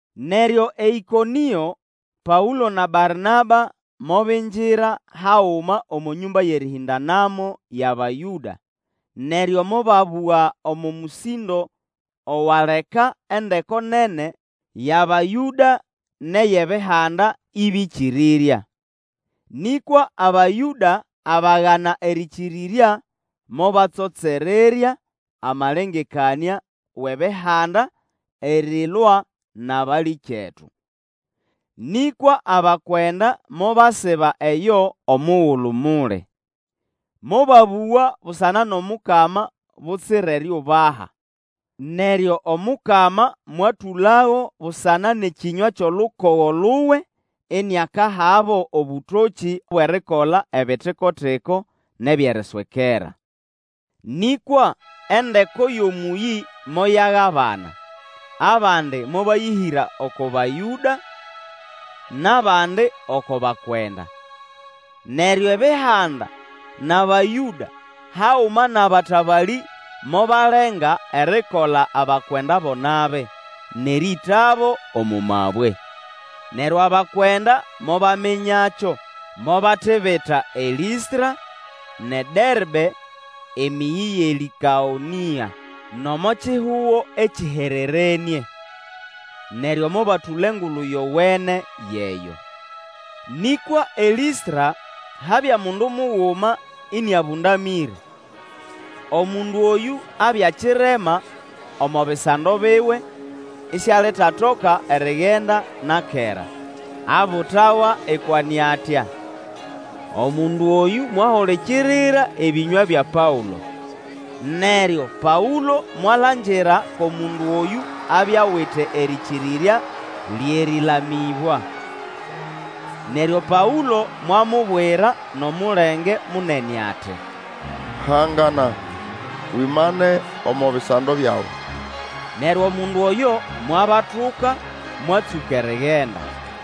Neryo eĨkonĩo Paũlo na Barnaba mobingira haguma omo nyũmba yʼerĩhĩndanamo yʼAbayũda, neryo mobabũga omo mũsĩndo owaleka endeko nene yʼAbayũda nʼeyʼEbihanda ĩbĩkĩrĩrya. Nĩkwa Abayũda abagana erĩkĩrĩrya mobatsotsererya amalengekanĩa wʼEbihanda, erilwa nʼabalĩkyetu. Nĩkwa abakwenda mobasiba eyo omugulu muli. Mobabũga busana nʼomukama butsira eriubaha. Neryo Omukama mwatũlago busana nʼekĩnywa kyʼolukogo luwe, iniakahabo obũtokĩ bwʼerikola ebitikotiko nʼebyʼeriswekera. Nĩkwa endeko yʼomũyĩ moyagabana, abandi mobayĩhĩra oko Bayũda, nʼabandi oko bakwenda. Neryo Ebihanda nʼAbayũda, haguma nʼabatabalĩ mobalenga erikola abakwenda bo nabi, nʼerĩĩtabo omo mabwe. Neryo abakwenda mobaminyakyo, mobatibita eLĩstra nʼeDerbe, emĩyĩ yʼeLĩkaonĩa, nʼomo kihugo ekĩhererenĩe. Neryo mobatũla Engulu Yowene yʼeyo. Nĩkwa eLĩstra habya mundu muguma ĩnĩabũndamĩre. Omundu oyũ abya kirema omo bisando biwe isialitatoka erigenda na kera, abutawa ikwane atya. Omundu oyũ mwahulikirira ebĩnywa bya Paũlo. Neryo Paũlo mwalangira ko mundu oyũ abya awite erĩkĩrĩrya lyʼerĩlamĩbwa. Neryo Paũlo mwamubwira nʼomulenge munene ati, Hangana, wimane omo bisando byawe! Neryo omundu oyo mwabatuka, mwatsũka erigenda.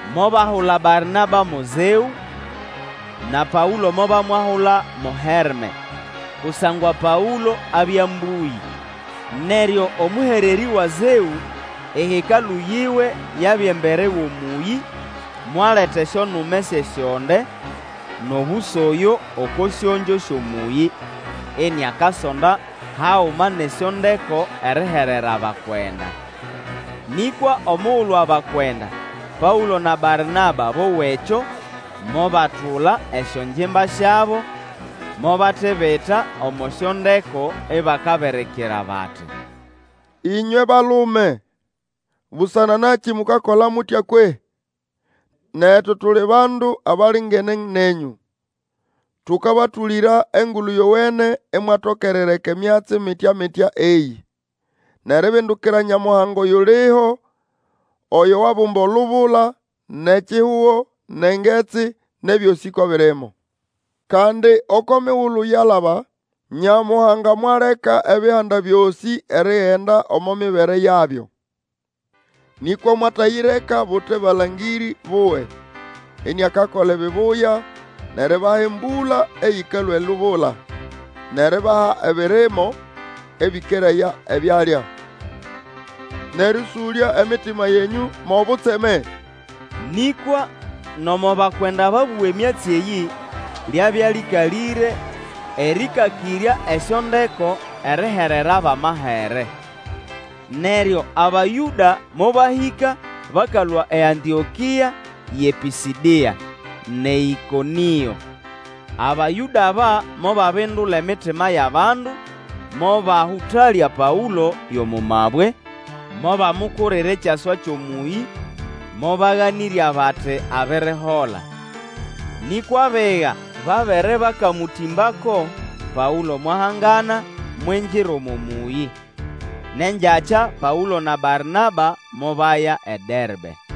Mobahula Barnaba mo Zeũ, na Paũlo mobamwahula mo Herme, kusangwa Paũlo abya mbũyĩ. Neryo omũhererĩ wa Zeũ, ehekalũ yiwe yabya embere wʼomũyĩ, mwaleta esyonume syʼesyonde nʼobũsoyo oko syongyo syʼomũyĩ, iniakasonda haguma nʼesyondeko eriherera abakwenda. Nĩkwa omugulu abakwenda, Paũlo na Barnaba bowa ekyo, mobatula esyongimba syabo, mobatibita omo syondeko ibakabirikira bati, Ĩnywe balume, busana nakĩ mukakola mutya kwehĩ? Netu tuli bandu abalingene nenyũ! Tũkabatũlĩra Engulu Yowene imwatoka erireka emyatsi mitya-mitya eyĩ, nʼeribindukira Nyamuhanga oyuliho, oyo wabumba olubula, nʼekihugo, nʼengetsi, nʼebyosĩ ko birimo. Kandi, oko migulu yalaba Nyamuhanga mwaleka Ebihanda byosĩ erigenda omo mibere yabyo. Nĩkwa mwatayireka bute balangĩrĩ buwe, iniakakola ebibuya nʼeribaha embũla eyĩkalũa elubula, nʼeribaha ebirimo ebĩkeraya ebyalya, nʼerĩũsũlya emitima yenyũ mwʼobutseme. Nĩkwa nomo bakwenda babũga emyatsi eyĩ, lyabya lĩkalĩre erĩkakĩrya esyondeko erihererabo amahere. Neryo Abayũda mobahĩka bakalũa eAntĩokĩa yʼePĩsĩdĩa, nʼeĨkonĩo. Abayũda aba mobabindula emitima yʼabandu, mobahũtalya Paũlo yʼomo mabwe, mobamukurira ekyaswa kyʼomũyĩ, mobaganĩrya, bati abirihola. Nĩkwa abiga babere bakamũtĩmbako, Paũlo mwahangana mwingira omo mũyĩ. Nʼengyakya Paũlo na Barnaba mobaya eDerbe.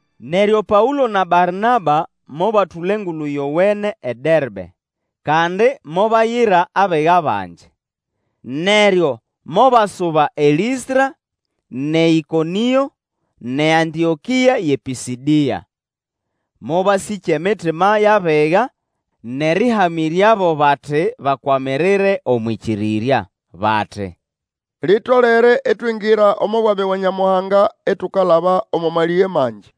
Neryo Paũlo na Barnaba mobatũla Engulu Yowene eDerbe, kandi mobayira abiga bangi. Neryo mobasuba eLĩstra, nʼeĨkonĩo, nʼeAntĩokĩa yʼePĩsĩdĩa. Mobasĩkya emitima yʼabiga, nʼerĩhamĩryabo bati bakwamirire omwʼĩkĩrĩrya. Bati, Litolere itwingira omo bwami bwa Nyamuhanga itukalaba omo malĩge mangi.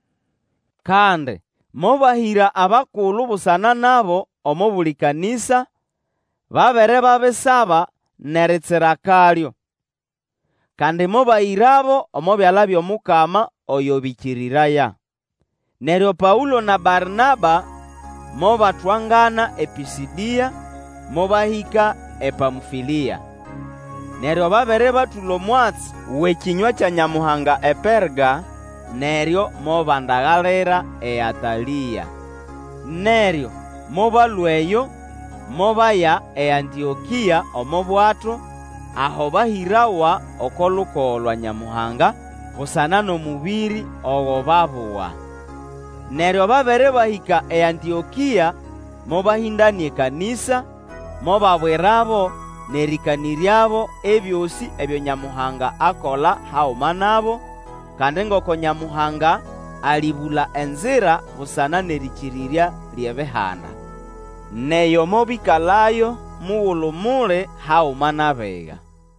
Kandi mobahĩra abakulu busana nabo omo buli kanĩsa, babere babisaba nʼeritsira akalyo. Kandi mobahĩrabo omo byala byʼomukama oyo bĩkĩrĩraya. Neryo Paũlo na Barnaba mobatwangana ePĩsĩdĩa, mobahĩka ePamfĩlĩa. Neryo babere batũla omwatsi wʼekĩnywa kya Nyamuhanga ePerga, neryo mobandagalira eAtalĩa. Neryo mobalũa eyo, mobaya eAntĩokĩa omo bwato, aho bahĩrawa oko lukogo lwa Nyamuhanga busana nʼomũbĩrĩ ogo babuga. Neryo babere bahĩka eAntĩokĩa, mobahĩndanĩa ekanĩsa, mobabwirabo nʼerĩkanĩryabo ebyosĩ ebyo Nyamuhanga akola haguma nabo, kandi ngoko Nyamuhanga alĩbũla enzira busana nʼerĩkĩrĩrya lyʼEbihanda. Nʼeyo mobĩkalayo mugulu muli haguma nʼabiga.